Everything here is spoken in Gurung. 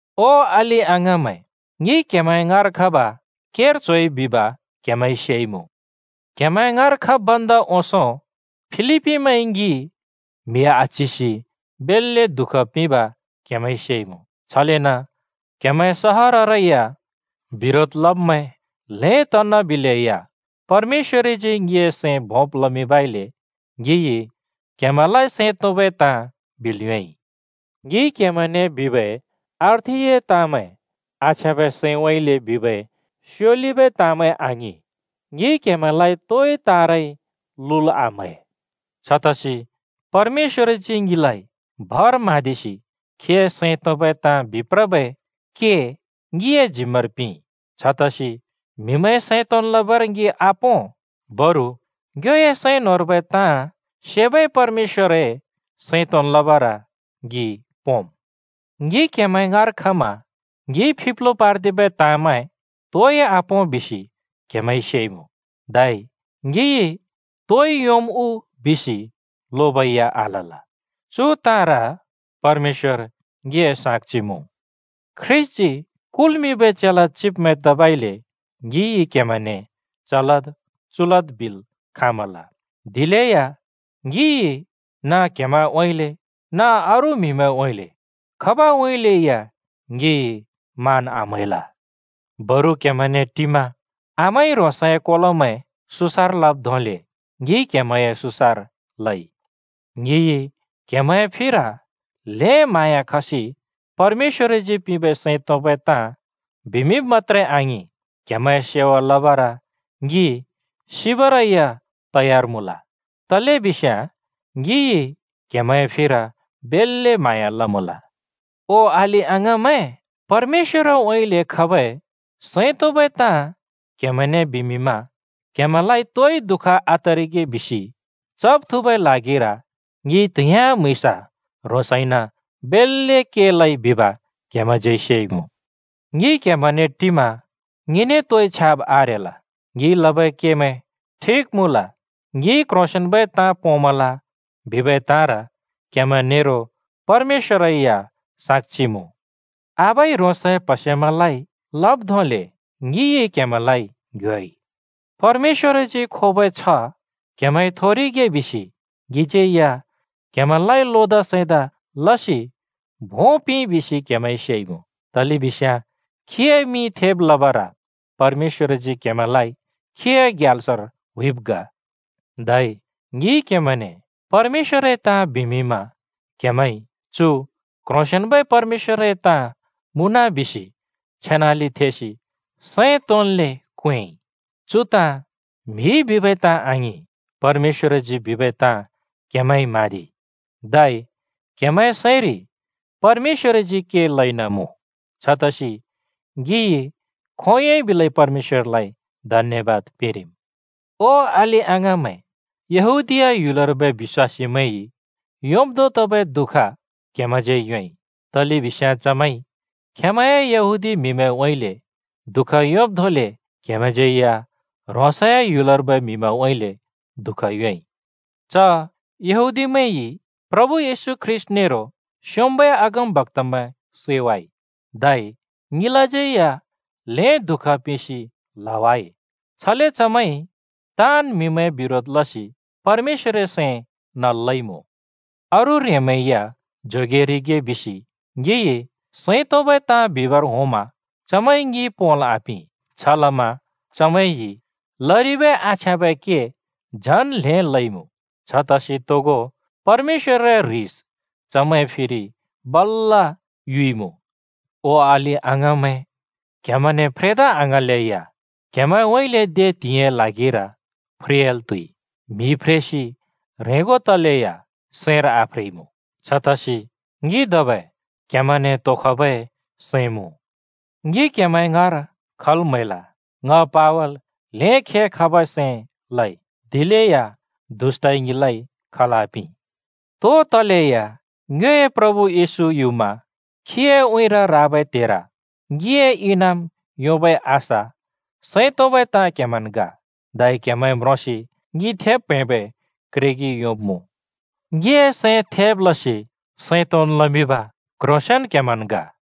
ओ अलि-अङाँमैं, ङि क्‍हेमैं ङाँर खबै केर च्होइ बिब क्हेमैंइ सेइमुँ। क्‍हेमैं ङाँर खब् भन्दा ओंसों फिलिप्‍पीमैंइ ङि म्हि आच्हिसि बेल्‍ले दुःख पिंब क्हेमैंइ सेइमुँ। छलेन क्‍हेमैंए सहररै या बिरोध लब्मैं ल्हें तनाबिलेया परमेश्‍वरजी ङिए सैं भोंब् लमिंबइले ङिइ क्‍हेमैंलाइ सैं तोंबै ताँ बिल् योंइ। ङिइ क्‍हेमैंने बिबै अर्थिए ताँमैं आछ्याँबै सैंउँइँले बिबै स्योलिबै ताँमैं आङिं, ङिइ क्हेमैंलाइ तोइ लुल् आम्है। छतसि परमेश्‍वरजी ङिलाइ भर म्हाँदिसि खीए सैं तोंबै ताँ बिप्रबै के ङिए जिम्‍मार पिंइ। छतसि म्हिमैंए सैं तोंन् लबर ङि आपो, बरु ङ्योए सैं न्होंर्बै ताँ सेबै परमेश्‍वरए सैं तोंन् लबर ङि पोंम्। ङि क्हेमैं ङाँर खमा ङिइ फिब्लो पार्दिबै ताँमैं तोइ आपों बिसि क्हेमैइ सेइमुँ। धै ङिइ तोइ योंम् उ बिसि लोबै या आलल, चु ताँर परमेश्‍वर ङिए साक्षि मुँ। ख्रीष्‍टजी कुल्मिंबै चेला चिब्मैं तबइले ङिइ क्हेमैंने “च लद्, चु लद्,” बिल् खाँमल। दिलेया ङिइ ना क्‍हेमैंउँइँले, ना अरू म्‍हिमैंउँइँले, खाबउँइँले या ङिइ मान आम्‍हैल, बरु क्‍हेमैंने टिमा आमाइ ह्रोंसए कोलोमैं सुसर लब् धोंले ङिइ क्‍हेमैंए सुसर लइ। ङिइ क्‍हेमैंए फिर ल्‍हें म्हाँया खसि परमेश्‍वरजी पिंबै सैं तोंबै ताँ बिमिंब् मत्‍त्रे आङिं, क्‍हेमैंए सेवा लबर ङि सिबरै या तयार मुँल, तलेबिस्याँ ङिइ क्‍हेमैंए फिर बेल्‍ले म्हाँया लमल। ओ अलि-अङाँमैं, परमेश्‍वरउँइँले खबै सैं तोंबै ताँ क्हेमैंने बिमिंमा क्‍हेमैंलाइ तोइ दुःख आतरिगे बिसि चब-थुँबए ल्हागिर ङिइ त्‍हिंयाँ म्‍हुँइँस ह्रोंसइन बेल्‍ले के लइ बिब क्‍हेमैंज्यै सेइमुँ। ङि क्‍हेमैंने टिमा ङिने तोइ छ्याब् आरेल, ङिइ लबै केमैं ठिक मुँल, ङिइ क्ह्रोंसेंन्बै ताँमैं पोंमल बिबै ताँर क्‍हेमैं नेरो परमेश्‍वर या साक्षि मुँ। आबाइ ह्रोंसए प्हसेमैंलाइ लब् धोंले ङिइ क्हेमैंलाइ ङ्ह‍योइ। परमेश्‍वरजी खोबै छ्ह क्हेमैंइ थोरिगे बिसि ङिज्यै या क्‍हेमैंलाइ लोदा सैंदा लसि भों पिंइ बिसि क्हेमैंइ सेइमुँ। तलेबिस्याँ खीए मिं थेब् लबर परमेश्‍वरजी क्हेमैंलाइ खीए ग्याल्सर हुइब् ग। धै ङिइ क्‍हेमैंने परमेश्‍वरए ताँ बिमिंमा क्‍हेमैंइ “चु क्‍ह्रोंसेंन परमेश्‍वरए ताँ मुँन” बिसि छेनाले थेसि सैं तोंन्‍ले क्‍वेंइ। चु ताँ म्‍हिइ बिबै ताँ आङिं, परमेश्‍वरजी बिबै ताँ क्‍हेमैंइ म्हाँदिइ। धै क्हेमैंए सैंरि परमेश्‍वरजी के लइनमुँ। छतसि ङिइ खोंयोंइ बिलै परमेश्‍वरलाइ धन्‍यबाद पिंरिम्। ओ अलि-अङाँमैं, यहूदीया ह्‍युलर्बै बिश्‍वासीमैंइ योंब् धों तबै दुःख क्हेमैंज्यै योंइ। तलेबिस्याँ चमैंइ खेंमैंए यहूदी म्हिमैंउँइँलेन् दुःख योंब् धोंले क्हेमैंज्यै या ह्रोंसए ह्‍युलर्बै म्‍हिमैंउँइँले दुःख योंइ। च यहूदीमैंइ प्रभु येशू ख्रीष्‍ट नेरो स्योंम्बै अगमबक्‍तामैं सैवाइ, धै ङिलाज्यै या ल्‍हें दुःख पिंसि ल्‍हावाइ। छले चमैंइ ताँन् म्हिमैंए बिरोध लसि परमेश्‍वरए सैं नल् लइमुँ। अरू ह्रेंमैंइ या जोगेरिगे बिसि ङिइ सैं तोंबै ताँ बिबर होंमा चमैंइ ङि पोंल् आपिं। छ लमा चमैंइ लरिबै आछ्याँबै के झन् ल्हें लइमु। छ तसि तोगो परमेश्‍वरए ह्रिस चमैंए फिरि बल्‍ल युइमु। ओ अलि-अङाँमैं, क्‍हेमैंने फ्रेदा आङ्हाँलेया क्हेमैंउँइँले दे त्हिंइए ल्हागिर फ्रेयाल् त्हुइ। म्हि फ्रेसि ह्रेंगो तलेया सैंर आफ्रेइमुँ। छतसि ङि धबै क्‍हेमैंने त्‍होखबै सैं मुँ। ङि क्हेमैं ङाँर खल् म्हैल। ङ पावल ल्‍हें खे खबै सैं लइ, दिलेया दुष्‍टइ ङिलाइ खल् आपिं। तो तलेया ङ्योए प्रभु येशू युमा खीए उँइँर राबै त्हेर ङिए इनाम योंबै आशा, सैं तोंबै ताँ क्हेमैंन् ग। धै क्हेमैं म्रोंसि ङि थेब् प्हैंबै क्रेगि योंब्मुँ। ङिए सैं थेब् लसि सैं तोंन् लमिंब क्ह्रोंसेंन क्हेमैंन् ग।